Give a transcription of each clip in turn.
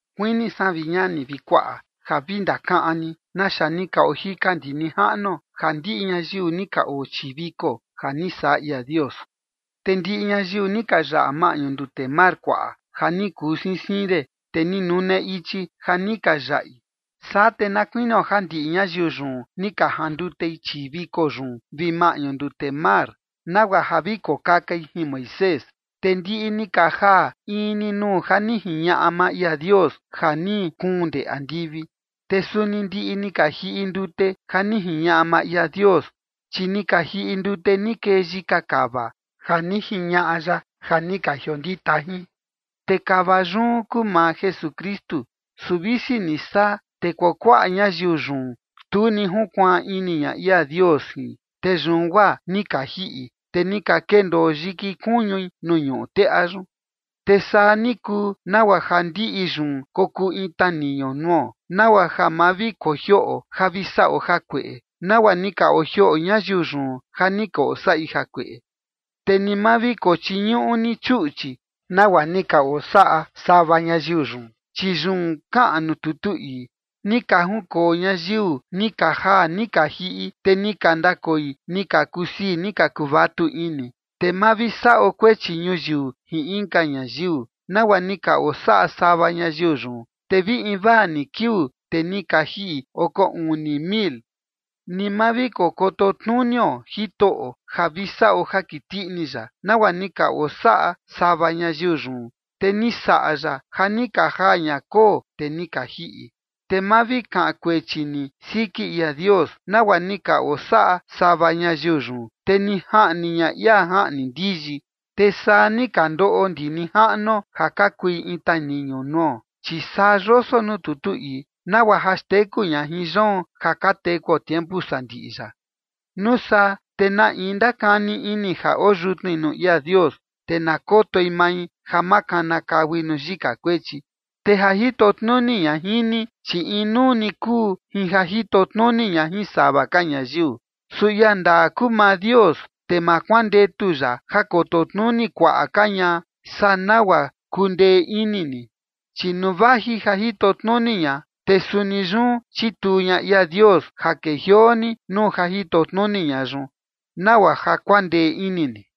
Kuini san, vi ñani vi kuaꞌa, ja vi ndakaꞌan ni naxa ni ka ojika ndi nijaꞌnuo, ja ndiꞌi ñayiu ni ka oo chii viko ja ni saꞌa ia Dios, te ndiꞌi ñayiu ni ka yaꞌa maꞌñu ndute Mar Kuaꞌa ja ni kuu siin siin de, te ni nune ichi ja ni ka yaꞌi. Saa te na kuinio ja ndiꞌi ñayiu yun ni ka jandutei chii viko yun vi maꞌñu ndute mar nagua ja vi kokakain jin Moisés. Te ndiꞌi ni ka jaa in ni nuu ja ni jiñaꞌa maa ia Dios ja ni kuun ndee andivi. Te suni ndiꞌi ni ka jiꞌi ndute ja ni jiñaꞌa maa ia Dios, chi ni ka jiꞌi ndute ni kee yika kava ja ni jiñaꞌa ya ja ni ka jiondita jin, te kava yun kuu maa Jesukristu. Su visi ni saa, te kuakuaꞌa ñayiu yun tu ni junkuaan ini ña ia Dios jin. Te yun guaa ni ka jiꞌi, te ni ka kendoo yiki kuñui nuu ñuꞌu teꞌa yun. Te saa ni kuu nagua ja ndiꞌi yun kokuu in taniñu nuo, nagua ja ma vi kojioꞌo ja vi saꞌo jakueꞌe, nagua ni ka ojioꞌo ñayiu yun ja ni ka osaꞌi jakueꞌe. Te ni ma vi kochiñuꞌu ni chuꞌchi, nagua ni ka osaꞌa sava ñayiu yun, chi yun kaꞌan nuu tutu ii: “Ni ka junkoo ñayiu ni ka jaa ni ka jiꞌi, te ni ka ndakoi ni ka kusii ni ka kuvatu ini”. Te ma vi saꞌo kuechi ñuyiu jin inka ñayiu, nagua ni ka osaꞌa sava ñayiu yun, te vi invaa ni kiuu, te ni ka jiꞌi oko uni mil. Ni ma vi koto tnunio Jitoꞌo ja vi saꞌo ja kiti ini ya, nagua ni ka osaꞌa sava ñayiu yun, te ni saꞌa ya ja ni ka jaa ña koo, te ni ka jiꞌi. Te ma vi kaꞌan kuechi ni siki ia Dios, nagua ni ka osaꞌa sava ñayiu yun, te ni jaꞌni ña ia jaꞌni ndiyi. Te saa ni ka ndoꞌo ndi nijaꞌnuo, ja ka kui in taniñu nuo, chi saa yoso nuu tutu ii, nagua ja xteku ña jin yoon ja ka tekuo tiempu sandiꞌi yaꞌa. Nuu saa te na in ndakani ini ja oo yutnui nuu ia Dios, te na kotoi mai ja ma kanakaui nuu yika kuechi. Te ja jito tnuni ña jin ni, chi inuu ni kuu jin ja jito tnuni ña jin sava ka ñayiu. Su ia ndaa kuu maa Dios, te ma kuandetu ya ja koto tnuni kuaꞌa ka ña saa nagua kundee ini ni, chi nuu vaji ja jito tnuni ña, te suni yun chituu ña ia Dios ja kejioo ni nuu ja jito tnuni ña yun, nagua ja kuandee ini ni.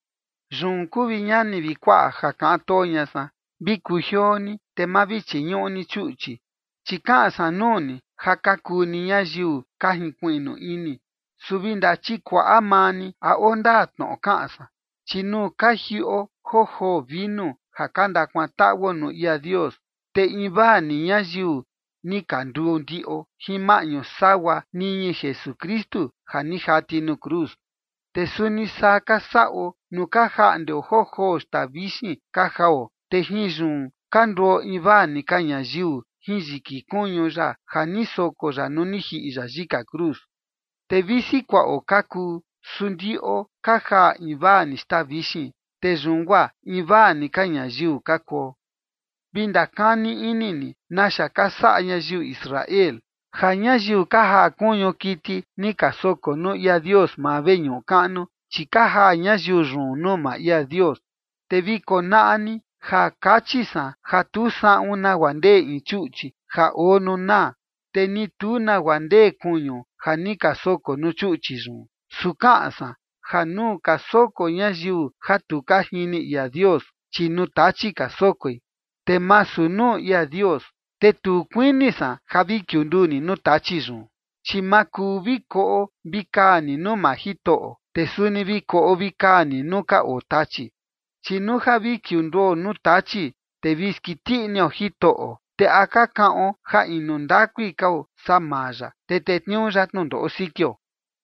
Yun kuu, vi ñani vi kuaꞌa, ja kaꞌan too ña san, vi kujioo ni, te ma vi chiñuꞌu ni chuꞌchi. Chi kaꞌan san nuu ni ja ka kuu ni ñayiu ka jinkuiꞌnu ini, su vi ndachikuaꞌa maa ni a oo ndaa tnoꞌo kaꞌan san. Chi nuu ka jiꞌo joo joo vinu ja ka ndakuantaꞌuo nuu ia Dios, te invaa ni ñayiu ni ka nduu ndiꞌo jin maꞌñu sagua niñi Jesukristu ja ni jati nuu cruz. Te suni saa ka saꞌo nuu ka jaꞌndeo joo joo xtaa vixin ka jao. Te jin yun ka nduo invaa ni ka ñayiu jin yiki kuñu ya ja ni soko ya nuu ni jiꞌi ya yika cruz. Te visi kuaꞌo ka kuu, su ndiꞌo ka jaa invaa ni xtaa vixin, te yun guaa invaa ni ka ñayiu ka kuo. Vi ndakani ini ni naxa ka saꞌa ñayiu Israel, ja ñayiu ka jaa kuñu kiti ni ka soko nuu ia Dios maa veñuꞌu kaꞌnu, chi ka jaa ñayiu yun nuu maa ia Dios. Te vi konaꞌa ni ja kachi san ja tu saꞌun nagua ndee in chuꞌchi ja oo nuu naa, te ni tu nagua ndee kuñu ja ni ka soko nuu chuꞌchi yun. Su kaꞌan san ja nuu ka soko ñayiu ja tu ka jini ia Dios, chi nuu tachi ka sokoi, te masu nuu ia Dios. Te tu kuini san ja vi kiunduu ni nuu tachi yun. Chi ma kuu vi koꞌo vi kaa ni nuu maa Jitoꞌo, te suni vi koꞌo vi kaa ni nuu ka oo tachi. Chi nuu ja vi kiunduo nuu tachi, te vi skiti inio Jitoꞌo, ¿te a ka kaꞌon ja inu ndakui kao saa maa ya, te tetniuu ya tnundoꞌo sikio?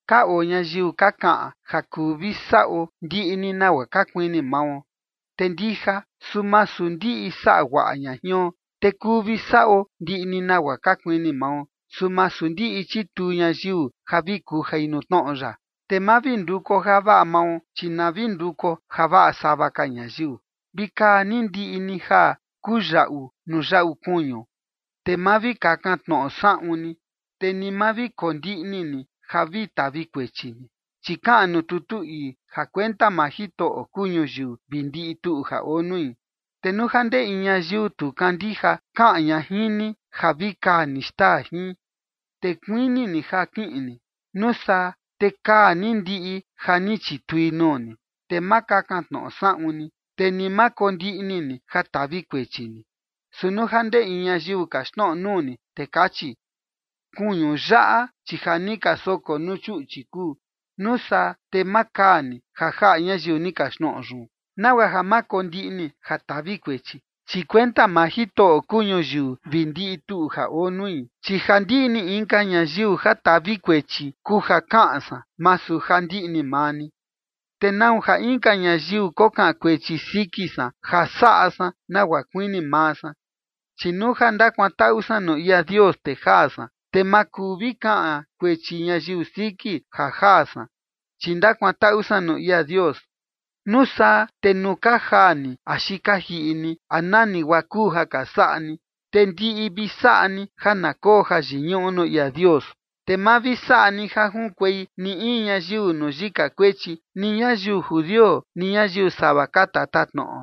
Ka oo ñayiu ka kaꞌan: “Ja kuu vi saꞌo ndiꞌi ni nagua ka kuini mao”. Te ndija, su masu ndiꞌi saꞌa guaꞌa ña jion. Te “kuu vi saꞌo ndiꞌi ni nagua ka kuini mao”, su masu ndiꞌi chituu ñayiu ja vi kujai nuu tnoꞌo ya. Te ma vi ndukuo javaꞌa mao, chi na vi ndukuo javaꞌa sava ka ñayiu. Vi kaa ni ndiꞌi ni ja kuyaꞌu nuu yaꞌu kuñu, te ma vi kakan tnoꞌo saꞌun ni, te ni ma vi kondiꞌni ni ja ka tavi kuechi ni. Chi kaꞌan nuu tutu ii: “Ja kuenta maa Jitoꞌo kuu ñuyiu vi ndiꞌi tuꞌu ja oo nui”. Te nuu ja ndee in ñayiu tu kandija kaꞌan ña jin ni ja vi kaa ni xtaa jin, te kuini ni ja kiꞌin ni, nuu saa te kaa ni ndiꞌi ja ni chitui nuu ni, te ma kakan tnoꞌo saꞌun ni, te ni ma kondiꞌni ni ja tavi kuechi ni. Su nuu ja ndee in ñayiu kaxtnoꞌo nuu ni, te kachi: “Kuñu yaꞌa, chi ja ni ka soko nuu chuꞌchi kuu”. Nuu saa te ma kaa ni, ja jaꞌa ñayiu ni kaxtnoꞌo yun, nagua ja ma kondiꞌni ja tavi kuechi, chi kuenta maa Jitoꞌo kuu ñuyiu vi ndiꞌi tuꞌu ja oo nui. Chi ja ndiꞌni inka ñayiu ja tavi kuechi kuu ja kaꞌan san, masu ja ndiꞌni maa ni. ¿Te nau ja inka ñayiu kokaꞌan kuechi siki san ja saꞌa san nagua kuini maa san? Chi nuu ja ndakuantaꞌu san nuu ia Dios, te jaa san, te ma kuu vi kaꞌan kuechi ñayiu siki ja jaa san, chi ndakuantaꞌu san nuu ia Dios. Nuu saa te nuu ka jaa ni axi ka jiꞌi ni, a nani guaa kuu ja ka saꞌa ni, te ndiꞌi vi saꞌa ni ja na koo jayiñuꞌu nuu ia Dios. Te ma vi saꞌa ni ja junkuei ni in ñayiu nuu yika kuechi, ni ñayiu judio, ni ñayiu sava ka tatatnoꞌo,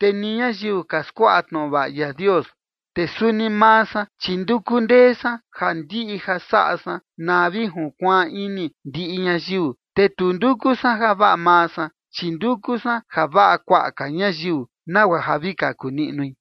te ni ñayiu ka skuaꞌa tnoꞌo vaꞌa ia Dios. Te suni maa san, chi nduku ndee san ja ndiꞌi ja saꞌa san na vi junkuaan ini ndiꞌi ñayiu. Te tu nduku san javaꞌa maa san, chi nduku san javaꞌa kuaꞌa ka ñayiu, nagua ja vi kaku niꞌnui.